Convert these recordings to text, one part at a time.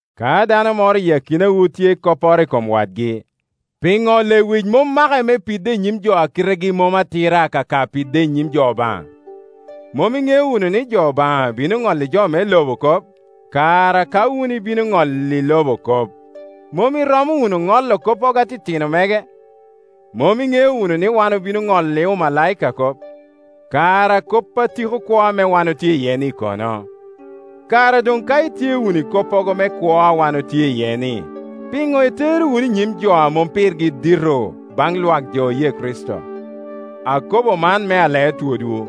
Ka dano moro iyi akinawu tye i kopporo i kom wadgi, piŋo lewic mom make me pide i nyim jo a kitegi mom atira akaka pide i nyim jo Obaŋa? Mom iŋeo wunu ni jo Obaŋa bino ŋolli jo me loba kop? Kara ka wun ibino wunu ŋolli loba kop, mom iromo wunu ŋolo koppogo atitino mege? Mom iŋeo wunu ni wan obino ŋolli omalaika kop? Kara kop a tiko kwo ame wan otye iye-ni kono? Kara doŋ ka itye wunu i koppogo me kwo a wan otye iye-ni, piŋo itero wunu i nyim jo a mom pirgi dito baŋ lwak jo oye Kricito? Akobo man me alee twodwu.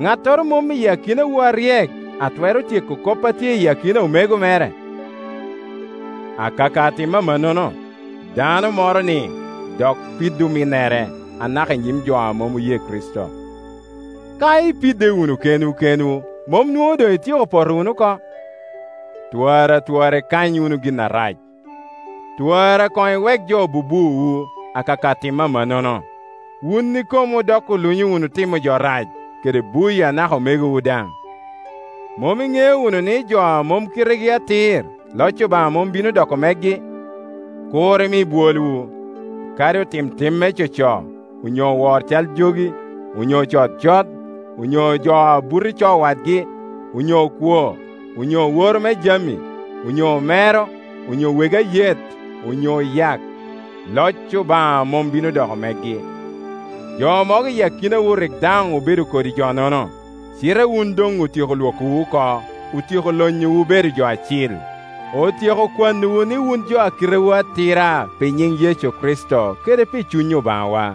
Ŋattoro mom i akinawu aryek a twero tyeko kop a tye i akina omego mere? Akaka timo amannono, dano moroni dok pido ominnere anaka i nyim jo a mom oye Kricito. Ka ipidde wunu kenwu kenwu, mom nwoŋo doŋ ityeko poto wunu oko? Twara twara ikany wunu gin arac. Twara koŋ iwek wunu jo bubuowu. Akaka timo amannono, wun ikomwu dok olunyo wunu timo jo rac, kede buyo anaka omegowu daŋ. Mom iŋeo wunu ni jo a mom kitegi atir, loc Obaŋa mom bino doko megi? Kur imi bwolwu; kadi otim tim me coco, onyo owor cal jogi, onyo ocod cot, on yo jo a buto i co wadgi, onyo okwo, onyo oworo me jami, onyo omero, onyo wegi ayet, onyo oyak, loc Obaŋa mom bino doko megi. Jo mogo i akinawu rik daŋ obedo kodi jo-nono. Cite wun doŋ otyeko Iwokowu oko, otyeko lonyowu bedo jo acil, otyeko kwanowu ni wun jo a kitewu atira pi nyiŋ Yecu Kricito kede pi Cuny Obaŋawa.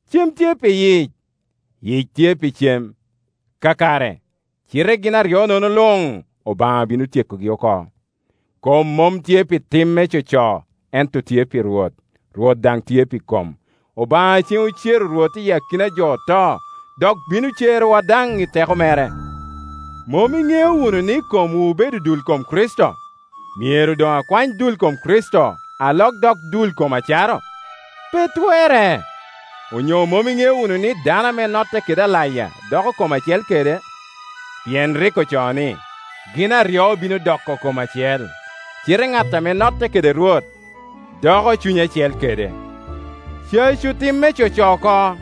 “Cem tye pi yic, yic tye pi cem.” Kakare, cite gin aryo-nono luŋ Obaŋa bino tyekogi oko. Kom mom tye pi tim me coco, ento tye pi Rwot, Rwot daŋ tye pi kom. Obaŋa cen ocero Rwot iyi akina a jo oto, dok bino cerowa daŋ i teko mere. Mom iŋeo wunu ni komwu obedo dul kom Kricito? Myero doŋ akwany dul kom Kricito, alok dok dul kom acaro? Pe twerre! Onyo mom iŋeo wunu ni dano ame notte kede alaya doko kom acel kede? Pien rik ocoo ni, “Gin aryo bino doko kom acel.” Cite ŋat a notte kede Rwot, doko cuny acel kede. Cacu tim me coco oko!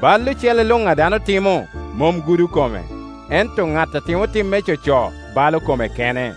Bal ocele luŋ a dano timo mom gudo kome; ento ŋat a timo tim me coco balo kome kene.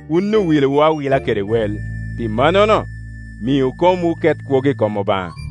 Wun owilowu awila kede wel. Pi mannono, miu komwu ket kwogo i kom Obaŋa.